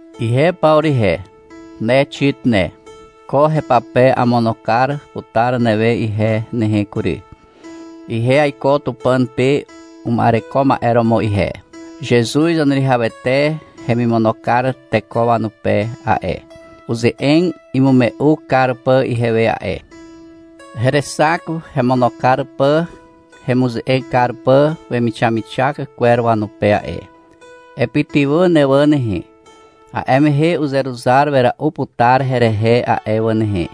Ihe Pawru ihe, ne Xit ne. Ko hepape amono kar putar newe ihe nehe kury. Ihe aiko Tupàn pe uma'ereko ma'e romo ihe. Zezuz Zaneruwihawete hemono kar teko wanupe a'e, uze'eg imume'u kar pà ihewe a'e. Herexak hemono kar pà hemuze'eg kar pà wemixamixak kwer wanupe a'e. — Epytywà ne wà nehe, a'e mehe uzeruzar wera'u putar herehe a'e wà nehe,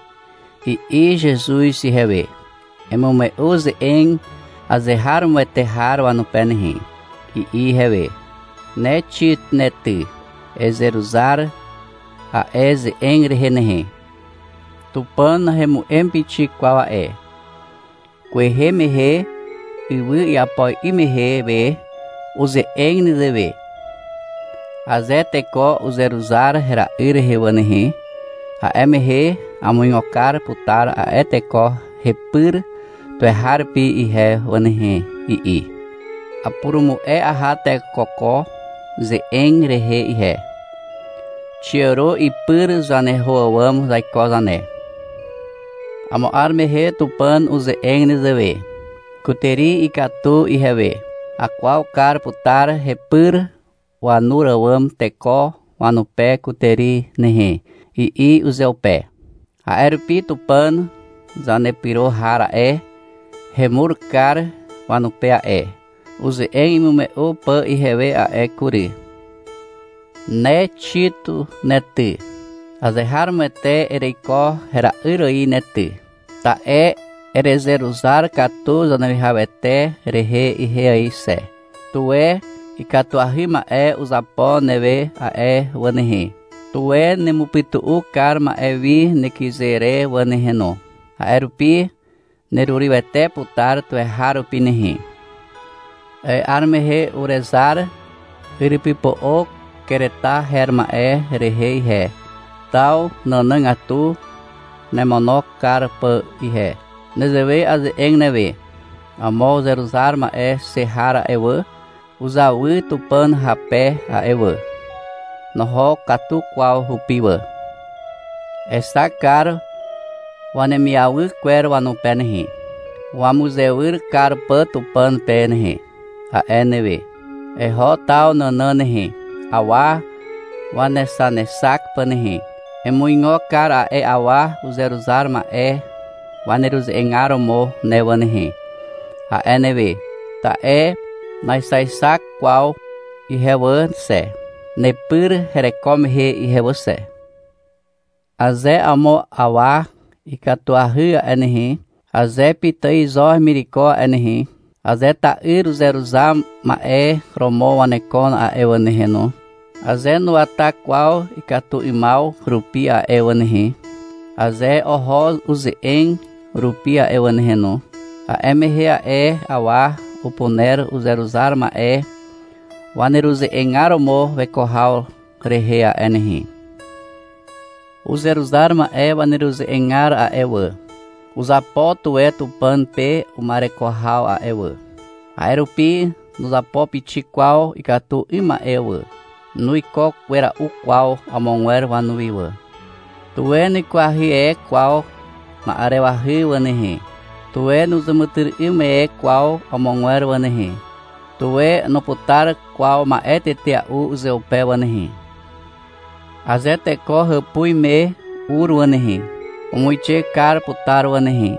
i'i Zezuz ihewe. — Emume'u ze'eg azeharomoete har wanupe nehe, i'i ihewe. Ne Xit ne ty, ezeruzar a'e ze'eg rehe nehe. Tupàn nahemu'em pixik kwaw a'e. Kwehe mehe, ywy iapo 'ym mehe we, uze'eg nezewe. — Aze teko uzeruzar hera'yr rehe wà nehe, a'e mehe amuigo kar putar a'e teko hepyr tuweharupi ihe wà nehe, i'i. Apurumu'e aha teko ko ze'eg rehe ihe. Xiàro ipyr zaneho àwàm zaiko zane. Amo 'ar mehe Tupàn uze'eg nezewe. — Kutàri ikatu ihewe. Akwaw kar putar hepyr wanur àwàm teko wanupe kutàri nehe, i'i uzeupe. A'e rupi Tupàn zanepyro har a'e, hemur kar wanupe a'e, uze'eg imume'u pà ihewe a'e: kury. Ne Xit ne ty. Azeharomoete ereiko hera'yr ài ne ty. Ta'e erezeruzar katu Zaneruwihawete rehe ihe ài xe. Tuwe ikatuahy ma'e uzapo newe a'e wà nehe. Tuwe nemupytu'u kar ma'e wi nekyze re wà nehe no. A'e rupi nerurywete putar tuweharupi nehe. A'e 'ar mehe urezar yrypypo'o Kereta her ma'e rehe ihe, taw nànàgatu nemono kar pà ihe. Nezewe aze'eg newe. — Amo uzeruzar ma'e xe har a'e wà, uzawy Tupàn hape a'e wà. Noho katu kwaw hupi wà. Exak kar wanemiawy kwer wanupe nehe, wamuzewyr kar pà Tupàn pe nehe, a'e newe. — Eho taw nànàn nehe, awa wanexanexak pà nehe. Emuigo kar a'e awa uzeruzar ma'e waneruze'egar romo ne wà nehe, a'e newe. (Ta'e naexaexak kwaw ihe wà xe, nepyr hereko mehe ihe wà xe.) Aze amo awa ikatuahy a'e nehe, aze pitài zo hemireko a'e nehe, aze ta'yr uzeruzar ma'e romo wanekon a'e wà nehe no, aze nuwata kwaw ikatu 'ymaw rupi a'e wà nehe, aze oho uze'eg rupi a'e wà nehe no, a'e mehe a'e awa upuner uzeruzar ma'e waneruze'egar romo weko haw rehe a'e nehe. Uzeruzar ma'e waneruze'egar a'e wà, uzapo tuwe Tupàn pe uma'ereko haw a'e wà. A'e rupi nuzapo pixik kwaw ikatu 'ym ma'e wà. Nuiko wera'u kwaw amogwer wanuwi wà. Tuwe nuikwahy e kwaw na'arewahy wà nehe. Tuwe nuzàmàtyry'ym e kwaw amogwer wà nehe. Tuwe nuputar kwaw ma'e tetea'u uzeupe wà nehe. Aze teko hàpuz me ur wà nehe, umuixe kar putar wà nehe,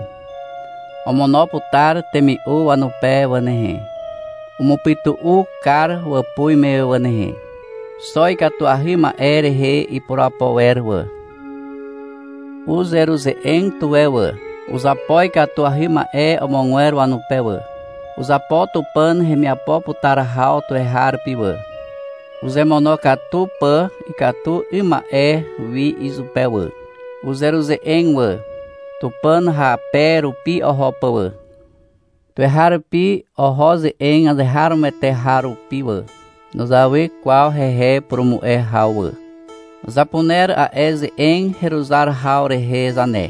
omono putar temi'u wanupe wà nehe. Umupytu'u kar wàpuz me wà nehe. Xo ikatuahy ma'e rehe ipurapo wer wà. Uzeruze'eg tuwe wà. Uzapo ikatuahy ma'e amogwer wanupe wà. Uzapo Tupàn hemiapo putar haw tuweharupi wà, uzemonokatu pà ikatu 'ym ma'e wi izupe wà. Uzeruze'eg wà, Tupàn hape rupi oho pà wà. Tuweharupi oho ze'eg azeharomoete har rupi wà. Nuzawy kwaw hehe purumu'e haw wà. Zapuner a'e ze'eg heruzar haw rehe zane.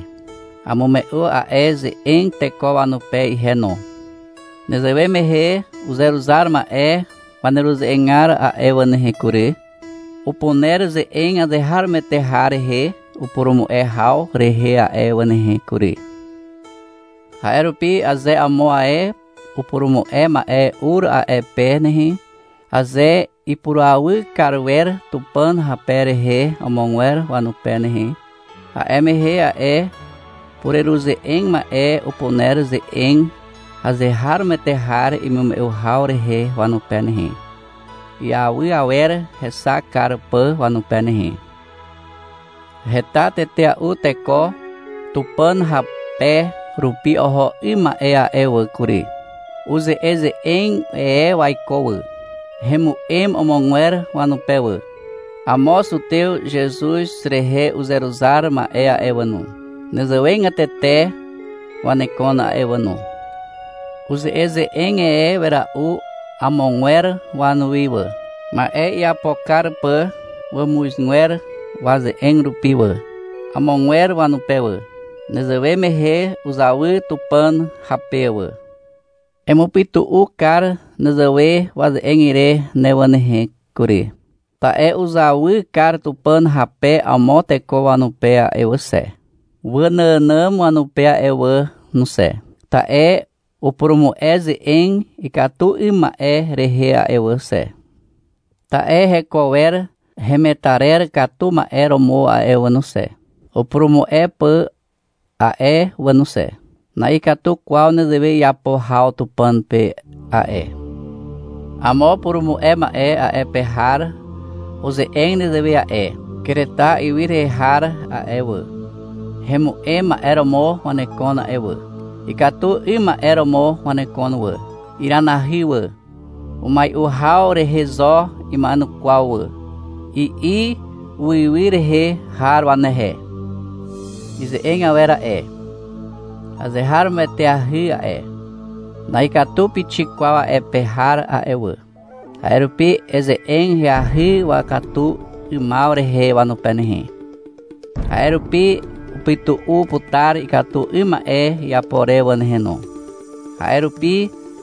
Amume'u a'e ze'eg teko wanupe ihe no. Nezewe mehe uzeruzar ma'e waneruze'egar a'e wà nehe kury, upuner ze'eg azeharomoete har rehe upurumu'e haw rehe a'e wà nehe kury. A'e rupi aze amo ae upurumu'e ma'e ur a'e pe nehe, aze ipurawy kar wer Tupàn hape rehe amogwer wanupe nehe, a'e mehe a'e pureruze'eg ma'e upuner ze'eg azeharomoete har imume'u haw rehe wanupe nehe, iawy awer hexak kar pà wanupe nehe. Heta tetea'u teko Tupàn hape rupi oho 'ym ma'e a'e wà kury. Uze'eze'eg e waiko wà. Hemu'em amogwer wanupe wà. Amo zutew Zezuz rehe uzeruzar ma'e a'e wà no, nezewegatete wanekon a'e wà no. Uze'eze'eg e wera'u amogwer wanuwi wà, ma'e iapo kar pà wàmuzgwer waze'eg rupi wà, amogwer wanupe wà. Nezewe mehe uzawy Tupàn hape wà. Emupytu'u kar nezewe waze'eg ire ne wà nehe kury. Ta'e uzawy kar Tupàn hape amo teko wanupe a'e wà xe, waànàànàm wanupe a'e wà no xe. Ta'e upurumu'e ze'eg ikatu 'ym ma'e rehe a'e wà xe. Ta'e heko wer hemetarer katu ma'e romo a'e wà no xe, upurumu'e pà a'e wà no xe. Na'ikatu kwaw nezewe iapo haw Tupàn pe a'e. Amo purumu'e ma'e a'e pe har uze'eg nezewe a'e. — Kereta ywy rehe har a'e wà, hemu'em ma'e romo wanekon a'e wà. Ikatu 'ym ma'e romo wanekon wà. Iranahy wà. Umai'u haw rehe zo ima'enukwaw wà, i'i uiwy rehe har wanehe. Ize'eg awer a'e, azeharomoeteahy a'e. Na'ikatu pixik kwaw a'e pe har a'e wà. A'e rupi eze'eg ahyahy wakatu 'ymaw rehe wanupe nehe. A'e rupi upytu'u putar ikatu 'ym ma'e iapo re wà nehe no. A'e rupi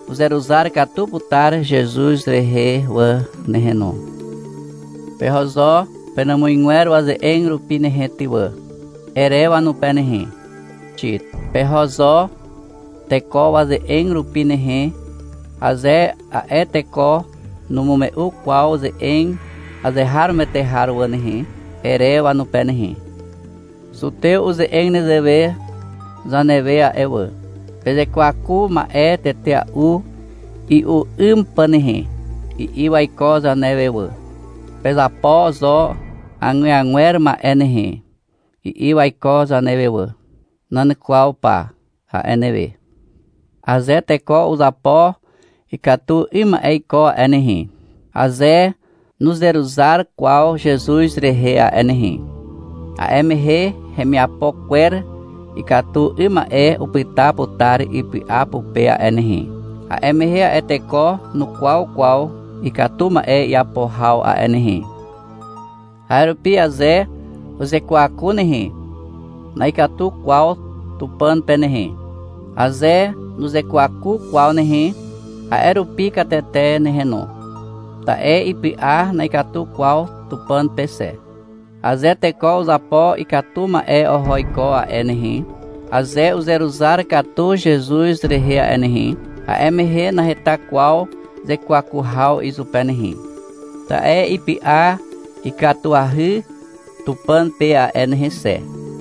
uzeruzar katu putar Zezuz rehe wà nehe no. — Peho zo penàmuzgwer waze'eg rupi nehe ty wà, ere wanupe nehe, Xit. — Peho zo teko waze'eg rupi nehe, aze a'e teko numume'u kwaw ze'eg azeharomoete har wà nehe, ere wanupe nehe. Zutew uze'eg nezewe zanewe a'e wà, — Pezekwaku ma'e tetea'u i'u 'ym pà nehe, i'i waiko zanewe wà. — Pezapo zo agweagwer ma'e nehe, i'i waiko zanewe wà. — Nan kwaw pa, a'e newe. Aze teko uzapo ikatu 'ym ma'e iko a'e nehe, aze nuzeruzar kwaw Zezuz rehe a'e nehe, a'e mehe hemiapo kwer ikatu 'ym ma'e upyta putar ipy'a pupe a'e nehe, a'e mehe a'e teko nukwaw kwaw ikatu ma'e iapo haw a'e nehe. A'e rupi aze uzekwaku nehe, na'ikatu kwaw Tupàn pe nehe, aze nuzekwaku kwaw nehe, a'e rupi katete nehe no, ta'e ipy'a na'ikatu kwaw Tupàn pe xe. Aze teko uzapo ikatu ma'e oho iko a'e nehe, aze uzeruzar katu Zezuz rehe a'e nehe, a'e mehe naheta kwaw zekwaku haw izupe nehe, ta'e ipy'a ikatuahy Tupàn pe a'e nehe xe.